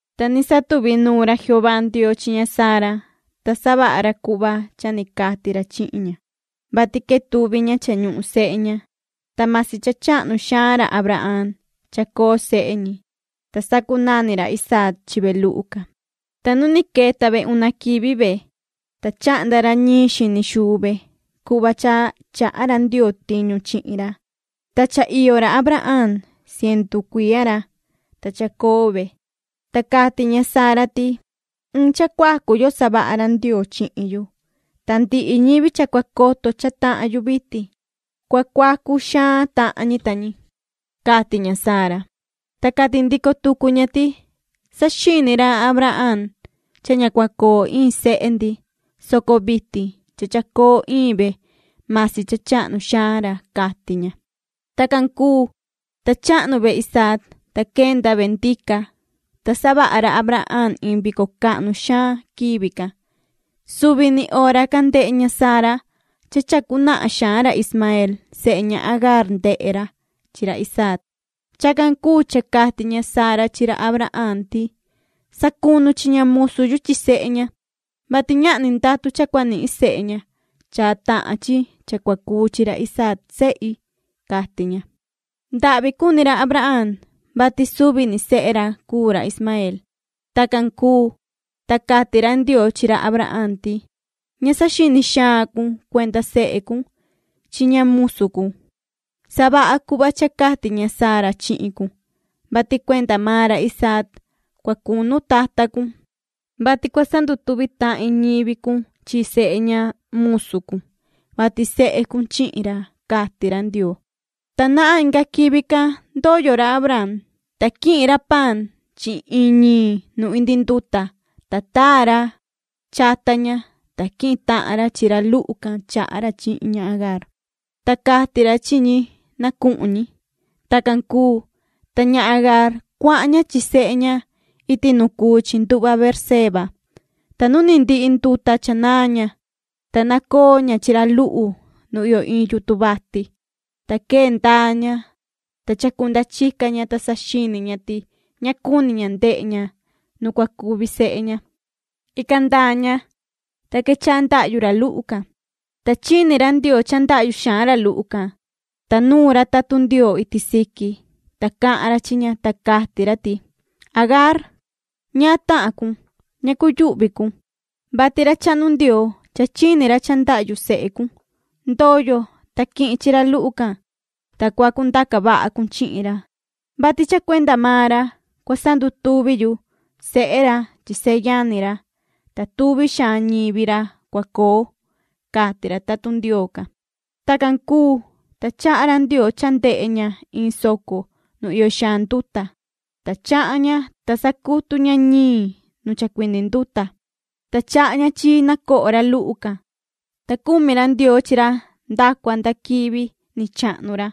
Ta ni satuvi nuun ra Jehová Ndioo chi ña Sara, ta savaha ra cuhva cha ni cati ra chihin ña, vati quetuvi ña cha ñuhun sehe ña, ta masi cha chahnu xaan ra Abraham chacoo sehe ñi. Ta sacunani ra Isaac chi ve luhu can. Ta nu ni queta ve una quivi ve, ta chahnda ra ñiin xini xuu ve cuhva cha chaha ra Ndioo tiñu chihin ra. Ta cha iyo ra Abraham cientu cuiya ra, ta chacoo ve. Ta cati ña Sara ti: “Iin cha cuacu yo savaha ra Ndioo chihin yu, ta ndihi ñivi cha cua coto cha tahan yu vitin, cua cuacu xaan tahan ñi ta ñi”, cati ña Sara. Ta cati ndico tucu ña ti:” Saxini ra Abraham cha ña cua coo iin sehe ndi, soco vitin cha chacoo iin ve, masi cha chahnu xaan ra”, cati ña. Tacan cuu, ta chahnu ve Isaac, ta quenda ve ndica, ta savaha ra Abraham iin vico cahnu xaan quivi can. Suvi ni hora can ndehe ña Sara cha chacu nahan xaan ra Ismaeel sehe ña Agaar ndehe ra chi ra Isaac. Chacan cuu cha cati ña Sara chi ra Abraham ti:” Sacunu chi ña musu yu chi sehe ña, vati ñahni ndatu cha cua nihin sehe ña cha tahan chi cha cua cuu chi ra Isaac sehi”, cati ña. Ndahvi cuni ra Abraham, vati suvi ni sehe ra cuu ra Ismaeel. Tacan cuu, ta cati ra Ndioo chi ra Abraham ti: “Ña saxini xaan cun cuenda sehe cun chi ña musu cun. Savaha cuhva cha cati ña Sara chihin cun, vati cuenda maan ra Isaac cua cunu tata cun, vati cua sandutuvi tahin ñivi cun chi sehe ña musu cun, vati sehe cun chihin ra”, cati ra Ndioo. Ta nahan inga quivi can ndoyo ra Abraham, ta quihin ra paan chi iin ñiin nu indi nduta, ta taa ra chata ña, ta quihin tahan ra chi ra luhu can chaha ra chi ña Agaar, ta cati ra chi ñi na cuhun ñi. Tacan cuu, ta ña Agaar cuahan ña chi sehe ña iti nu cuu chi nduhva Beerseba. Ta nu ni ndihi nduta cha naan ña, ta nacoo ña chi ra luhu nu iyo iin yutun vati. Ta quee ndaa ña, ta chacunda chica ña, ta saxini ña ti ña cuni ña ndehe ña nu cua cuvi sehe ña. Ican ndaa ña, ta quechaha ndahyu ra luhu can. Ta chini ra Ndioo cha ndahyu xaan ra luhu can, ta nuun ra tatun Ndioo iti siqui, ta cahan ra chi ña, ta cati ra ti: “Agaar ¿ñaan tahan cun? Ña cuyuhvi cun, vati ra chahnu Ndioo, cha chini ra cha ndahyu sehe cun. Ndoyo, ta quihin chi ra luhu can, ta cua cundaca vaha cun chihin ra, vati cha cuenda maan ra cua sandutuvi yu sehe ra chi seyani ra, ta tuvi xaan ñivi ra cua coo”, cati ra tatun Ndioo can. Tacan cuu, ta chaha ra Ndioo cha ndehe ña iin soco nu iyo xaan nduta, ta chahan ña, ta sacutu ña ñiin nu chacuindi nduta, ta chaha ña chi na coho ra luhu can. Ta cumi ra Ndioo chi ra nda cua nda quivi ni chahnu ra.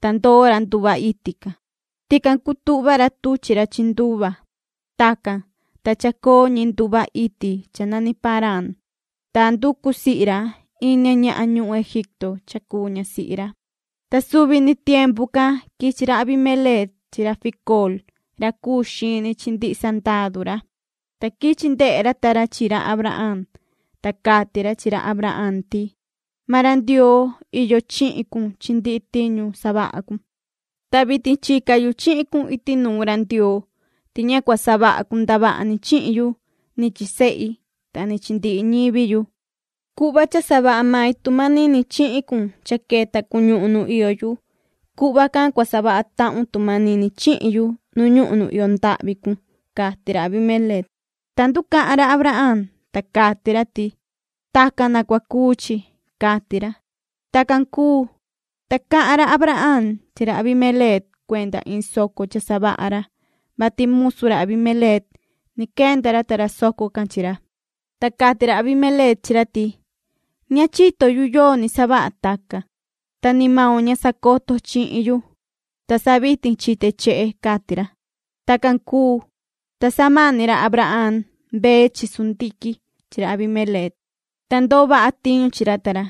Ta ndoo ra nduhva iti can. Tican cutuhva ra tuchi ra chi nduva. Tacan, ta chacoo ñi nduhva iti cha nani Parán, ta nducu sihi ra iin ña ñahan ñuhun Egipto cha cuu ñasihi ra. Ta suvi ni tiempu can quichi ra Abimeleec chi ra Ficool, ra cuu xini chi ndihi sandadu ra, ta quichi ndehe ra ta ra chi ra Abraham, ta cati ra chi ra Abraham ti: ―Maan ra Ndioo iyo chihin cun chi ndihi tiñu savaha cun. Ta vitin chica yu chihin cun iti nuun ra Ndioo ti ña cua savaha cun ndavaha ni chihin yu ni chi sehi ta ni chi ndihi ñivi yu. Cuhva cha savaha mai tu manini chihin cun cha queta cun ñuhun nu iyo yu, cuhva can cua savaha tahun tu manini chihin yu nu ñuhun nu iyo ndahvi cun ―cati ra Abimeleec. Ta nducahan ra Abraham, ta cati ra ti: ―Tacan na cua cuu chi ―cati ra. Tacan cuu, ta cahan ra Abraham chi ra Abimeleec cuenda iin soco cha savaha ra, vati musu ra Abimeleec ni quenda ra ta ra soco can chi ra. Ta cati ra Abimeleec chi ra ti: ―Ña chito yu yoo ni savaha tacan, ta ni maun ña sacoto chihin yu, ta sa vitin chite chehe ―cati ra. Tacan cuu, ta samani ra Abraham mbee, chivu, sundiquin chi ra Abimeleec, ta ndoo vaha tiñu chi ra ta ra.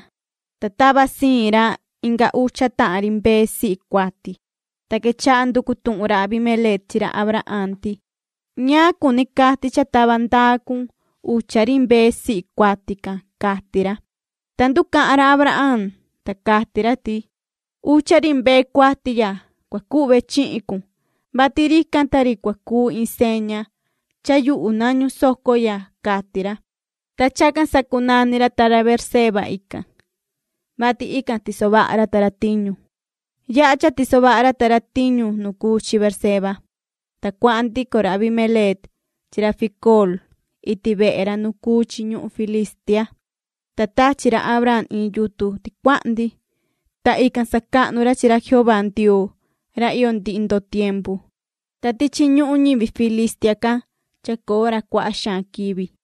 Ta tava siin ra inga ucha tahan ri mbee sihi cuati. Ta quechaha nducu tuhun ra Abimeleec chi ra Abraham ti: ―¿Ñaan cuni cati cha tava ndaa cun ucha ri mbee sihi cuati can? ―cati ra. Ta nducahan ra Abraham, ta cati ra ti: ―Ucha ri mbee cuati ya cua cuhve chihin cun, vati rican ta ri cua cuu iin seña cha yuhu nañu soco ya ―cati ra. Ta chacan sacunani ra ta ra Beerseba ican, vati ican tiso vaha ra ta ra tiñu. Yaha cha tiso vaha ra ta ra tiñu nu cuu chi Beerseba, ta cuahan ndico ra Abimeleec chi ra Ficool iti vehe ra nu cuu chi ñuhun Filistia. Ta tachi ra Abraham iin yutun ticuahndi, ta ican sacahnu ra chi ra Jehová Ndioo ra iyo ndihi ndoo tiempu. Ta tichi ñuhun ñivi ñuhun Filistia can chacoo ra cuaha xaan quivi.